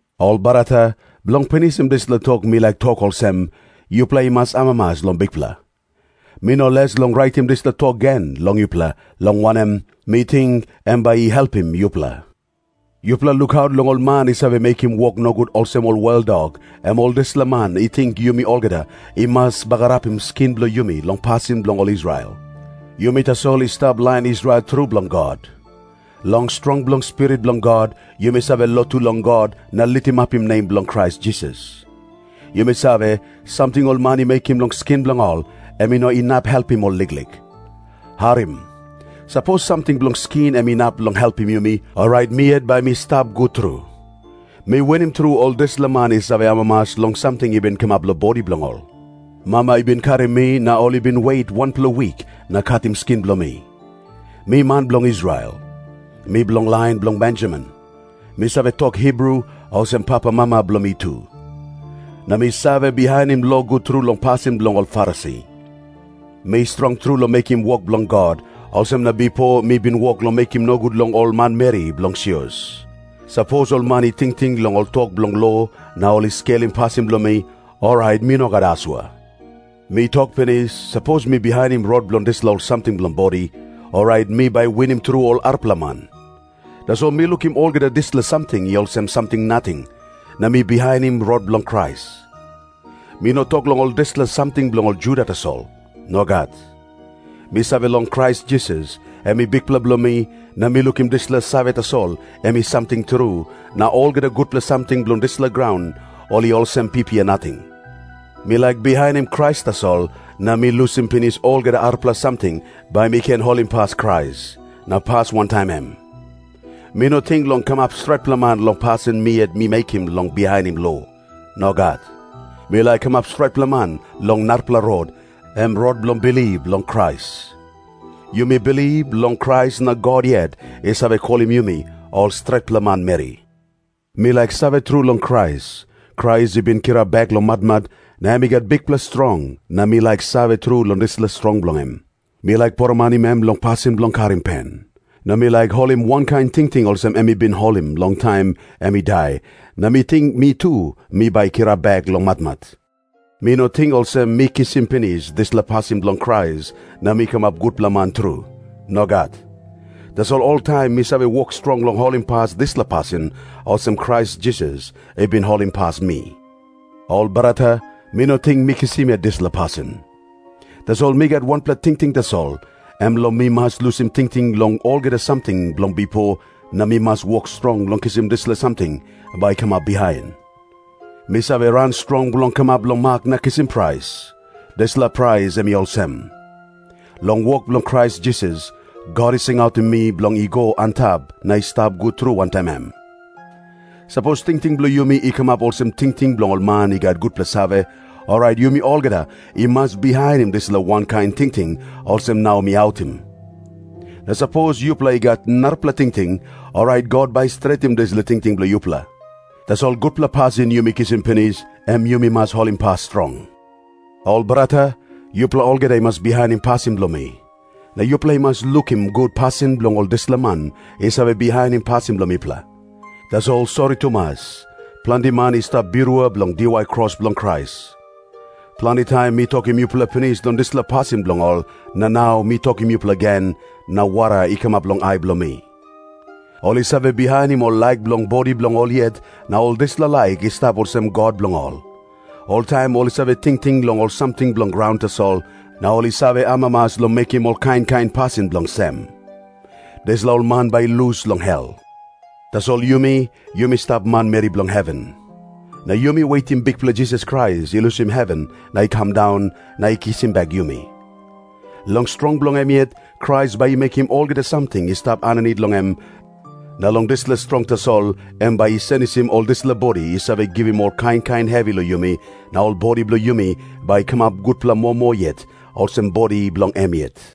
Ol brata, bilong pinisim dispela tok mi laik tok olsem, yupela i mas amamas long Bikpela. Mi no les long raitim dispela tok gen long yupela, long wanem, mi ting em bai i helpim yupela. Yupela lukaut long ol man i save mekim wok nogut olsem ol weldok, em ol dispela man i ting yumi olgeta i mas bagarapim skin bilong yumi long pasin bilong ol Israel. Yumi tasol i stap lain Israel tru bilong God. Long strong bilong Spirit bilong God yumi save lotu long God na litimapim nem bilong Krais Jisas. Yumi save, samting ol man i mekim long skin bilong ol, em i no inap helpim ol liklik. Harim. Sapos samting bilong skin em inap long helpim yumi, orait mi yet mi bai stap gut tru. Mi winim tru ol dispela man i save amamas long samting i bin kamap long bodi bilong ol. Mama i bin karim mi, na ol i bin wet wanpela wik na katim skin bilong mi. Mi man bilong Israel. Mi bilong lain bilong Benjamin. Mi save tok Hibru, olsem papamama bilong mi tu. Na mi save bihainim lo gut tru long pasin bilong ol Farisi. Mi strong tru long mekim wok bilong God, olsem na bipo mi bin wok long mekim nogut long ol manmeri bilong sios. Sapos ol man i tingting long ol tok bilong lo na ol i skelim pasin bilong mi, orait mi no gat asua. Mi tok pinis, sapos mi bihainim rot bilong dispela ol samting bilong bodi, orait mi bai winim tru ol arapela man. Tasol mi lukim olgeta dispela samting i olsem samting nating, na mi bihainim rot bilong Krais. Mi no tok long ol dispela samting bilong ol Juda tasol. Nogat. Mi save long Krais Jisas, em i Bikpela bilong mi, na mi lukim dispela save tasol em i samting tru, na olgeta gutpela samting bilong dispela graun ol i olsem pipia nating. Mi laik bihainim Krais tasol, na mi lusim pinis olgeta arapela samting, bai mi ken holimpas Krais na pas wantaim em. Mi no ting long kamap stretpela man long pasin mi yet mi mekim long bihainim lo. Nogat. Mi laik kamap stretpela man long narapela rot, em rot bilong bilip long Krais. Yumi bilip long Krais na God yet i save kolim yumi ol stretpela manmeri. Mi laik save tru long Krais. Krais i bin kirap bek long matmat, na em i gat bikpela strong, na mi laik save tru long dispela strong bilong em. Mi laik poromanim em long pasin bilong karim pen. Na mi laik holim wankain tingting olsem em i bin holim long taim em i dai, na mi ting mi tu mi bai kirap bek long matmat. Mi no ting olsem mi kisim pinis dispela pasin bilong Krais, na mi kamap gutpela man tru. Nogat. Tasol oltaim mi save wok strong long holimpas dispela pasin, olsem Krais Jisas i bin holimpas mi. Ol brata, mi no ting mi kisim yet dispela pasin. Tasol mi gat wanpela tingting tasol, em long mi mas lusim tingting long olgeta samting bilong bipo, na mi mas wok strong long kisim dispela samting bai i kamap bihain. Mi save ran strong bilong kamap long mak na kisim prais. Dispela prais em i olsem. Long wok bilong Krais Jisas, God i singautim mi bilong i go antap na i stap gut tru wantaim em. Sapos tingting bilong yumi i kamap olsem tingting bilong ol man i gat gutpela save, orait yumi olgeta i mas bihainim dispela wankain tingting olsem nau mi autim. Na sapos yupela i gat narapela tingting, orait God bai i stretim dispela tingting bilong yupela. Tasol gutpela pasin yumi kisim pinis, em yumi mas holimpas strong. Ol brata, yupela olgeta i mas bihainim pasin bilong mi. Na yupela i mas lukim gut pasin bilong ol dispela man i save bihainim pasin bilong mipela. Tasol sori tumas, planti man i stap birua bilong diwai kros bilong Krais. Planti taim mi tokim yupela pinis long dispela pasin bilong ol, na nau mi tokim yupela gen, na wara i kamap long ai bilong mi. Ol i save bihainim ol laik bilong bodi bilong ol yet, na ol dispela laik i stap olsem god bilong ol. Oltaim ol i save tingting long ol samting bilong graun tasol, na ol i save amamas long mekim ol kain kain pasin bilong sem. Dispela ol man bai i lus long hel. Tasol yumi, yumi stap manmeri bilong heven. Na yumi wetim Bikpela Jisas Krais i lusim heven na i kam daun, na i kisim bek yumi. Long strong bilong em yet, Krais bai i mekim olgeta samting i stap aninit long em, na long dispela strong tasol em bai i senisim ol dispela bodi i save givim ol kain kain hevi long yumi, na ol bodi bilong yumi bai i kamap gutpela moa moa yet olsem bodi bilong em yet.